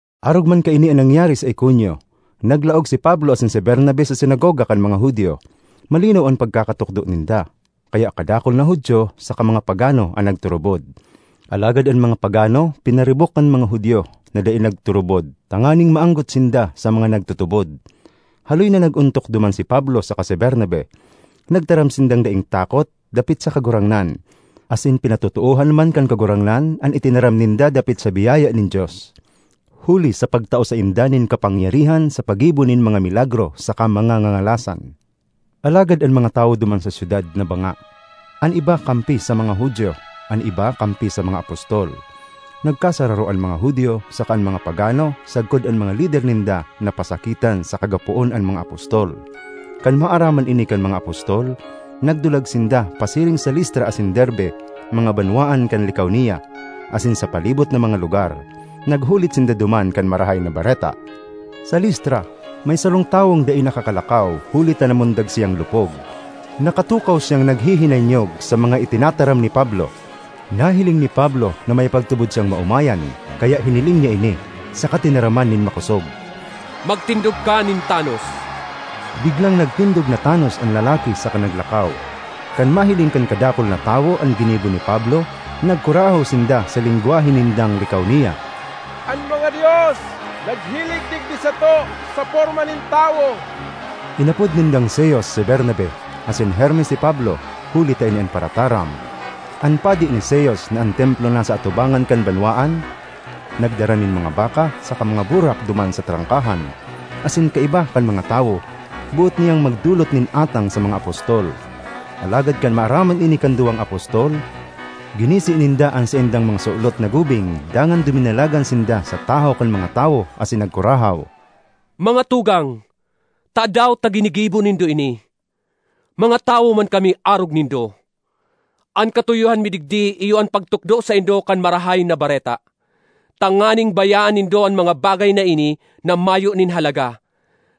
Arog man kaini an nangyari sa Iconio: naglaog si Pablo asin si Bernabe sa sinagoga kan mga Judio. Malinaw an pagkakatukdo ninda, kaya kadakul na Judio saka mga pagano an nagturubod. Alagad an mga pagano pinaribok kan mga Judio na dai nagturubod tanganing maanggot sinda sa mga nagtutubod. Haloy na nag-ontok duman si Pablo saka si Bernabe. Nagtaram sindang daing takot dapit sa Kagurangnan, asin pinatotoohan man kan Kagurangnan an itinaram ninda dapit sa biyaya nin Dios, huli sa pagtao sainda nin kapangyarihan sa paggibo nin mga milagro saka mga ngangalasan. Alagad an mga tawo duman sa syudad nabanga: an iba kampi sa mga Judio, an iba kampi sa mga apostol. Nagkasararo an mga Judio saka an mga pagano sagkod an mga lider ninda na pasakitan saka gapoon an mga apostol. Kan maaraman ini kan mga apostol, nagdulag sinda pasiring sa Listra asin Derbe, mga banwaan kan Licaonia, asin sa palibot na mga lugar. Naghulit sinda duman kan Marahay na Bareta. Sa Listra, may sarong tawong dai nakakalakaw huli ta namundag siyang lupog. Nakatukaw siyang naghihinanyog sa mga itinataram ni Pablo. Nahiling ni Pablo na may pagtubod siyang maomayan, kaya hiniling niya ini, saka tinaraman nin makosog, “Magtindog ka nin tanos!” Biglang nagtindog na tanos an lalaki saka naglakaw. Kan mahiling kan kadakul na tawo an ginibo ni Pablo, nagkurahaw sinda sa lengwahe nindang Licaonia, “An mga dios naghilig digdi sato sa porma nin tawo!” Inapod nindang Zeus si Bernabe asin Hermes si Pablo, huli ta ini an parataram. An padi ni Zeus, na an templo nasa atubangan kan banwaan, nagdara nin mga baka saka mga burak duman sa trangkahan; asin kaiba kan mga tawo, boot niyang magdolot nin atang sa mga apostol. Alagad kan maaraman ini kan duwang apostol, ginisi ninda an saindang mga sulot na gubing dangan duminalagan sinda sa tahaw kan mga tawo asin nagkurahaw, ”Mga tugang, tadaw ta ginigibo nindo ini? Mga tawo man kami arog nindo! An katuyohan mi digdi iyo an pagtukdo saindo kan Marahay na Bareta, tanganing bayaan nindo an mga bagay na ini na mayo nin halaga,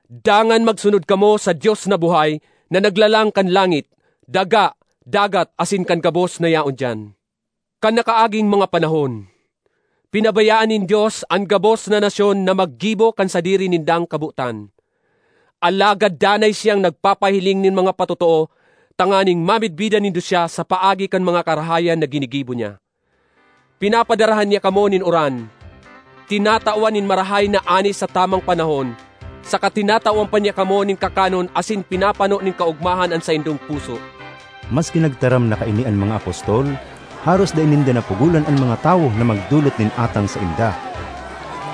dangan magsunod kamo sa Dios na buhay na naglalang kan langit, daga, dagat, asin kan gabos na yaon diyan. "Kan nakaaging mga panahon, pinabayaan nin Dios an gabos na nasyon na maggibo kan sadiri nindang kabotan. Alagad danay siyang nagpapahiling nin mga patotoo tanganing mamidbidan nindo siya sa paagi kan mga karahayan na ginigibo niya: pinapadarhan niya kamo nin uran, tinatawan nin marahay na ani sa tamang panahon saka tinatawan pa niya kamo nin kakanon asin pinapano nin kaogmahan an saindong puso.” Maski nagtaram na kaini an mga apostol, haros dai ninda napugolan an mga tawo na magdolot nin atang sainda.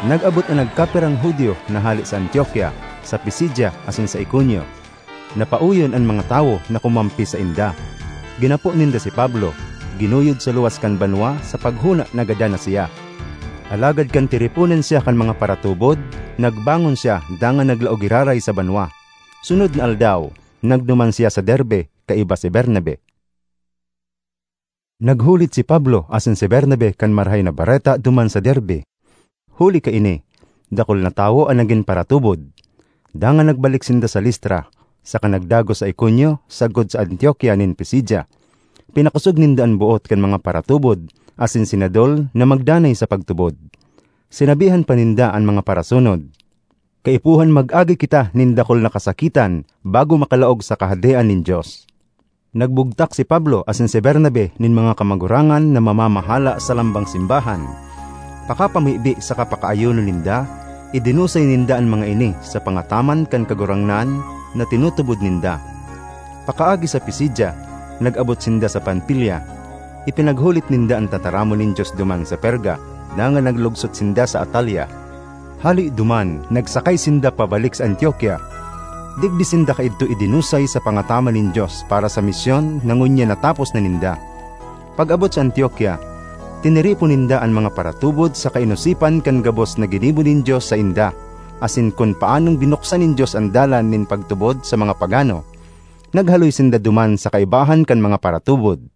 Nag-abot an nagkapirang Judio na hale sa Antiokia, sa Pisidia asin sa Iconio; napaoyon an mga tawo na kumampi sainda. Ginapo ninda si Pablo, ginuyod sa luwas kan banwa sa paghona na gadan na siya. Alagad kan tiriponan siya kan mga paratubod, nagbangon siya dangan naglaog giraray sa banwa. Sunod na aldaw, nagduman siya sa Derbe kaiba si Bernabe. Naghulit si Pablo asin si Bernabe kan Marahay na Bareta duman sa Derbe. Huli kaini, dakul na tawo an nagin paratubod. Dangan nagbalik sinda sa Listra, saka nagdagos sa Iconio sagkod sa Antiokia nin Pisidia. Pinakosog ninda an boot kan mga paratubod asin sinadol na magdanay sa pagtubod. Sinabihan pa ninda an mga parasunod, “Kaipuhan mag-agi kita nin dakul na kasakitan bago makalaog sa Kahadean nin Dios.” Nagbugtak si Pablo asin si Bernabe nin mga kamagurangan na mamamahala sa lambang simbahan. Pakapamibi saka pakaayuno ninda, idinusay ninda an mga ini sa pangataman kan Kagurangnan na tinutubod ninda. Pakaagi sa Pisidia, nag-abot sinda sa Panfilia. Ipinaghulit ninda an tataramon nin Dios duman sa Perga dangan naglugsot sinda sa Atalia; hale duman nagsakay sinda pabalik sa Antiokia. Digdi sinda kaidto idinusay sa pangataman nin Dios para sa misyon na ngunyan natapos na ninda. Pag-abot sa Antiokia, tiniripon ninda an mga paratubod saka inosipan kan gabos na ginibo nin Dios sainda, asin kun paanong binuksan nin Dios an dalan nin pagtubod sa mga pagano. Naghaloy sinda duman sa kaibahan kan mga paratubod.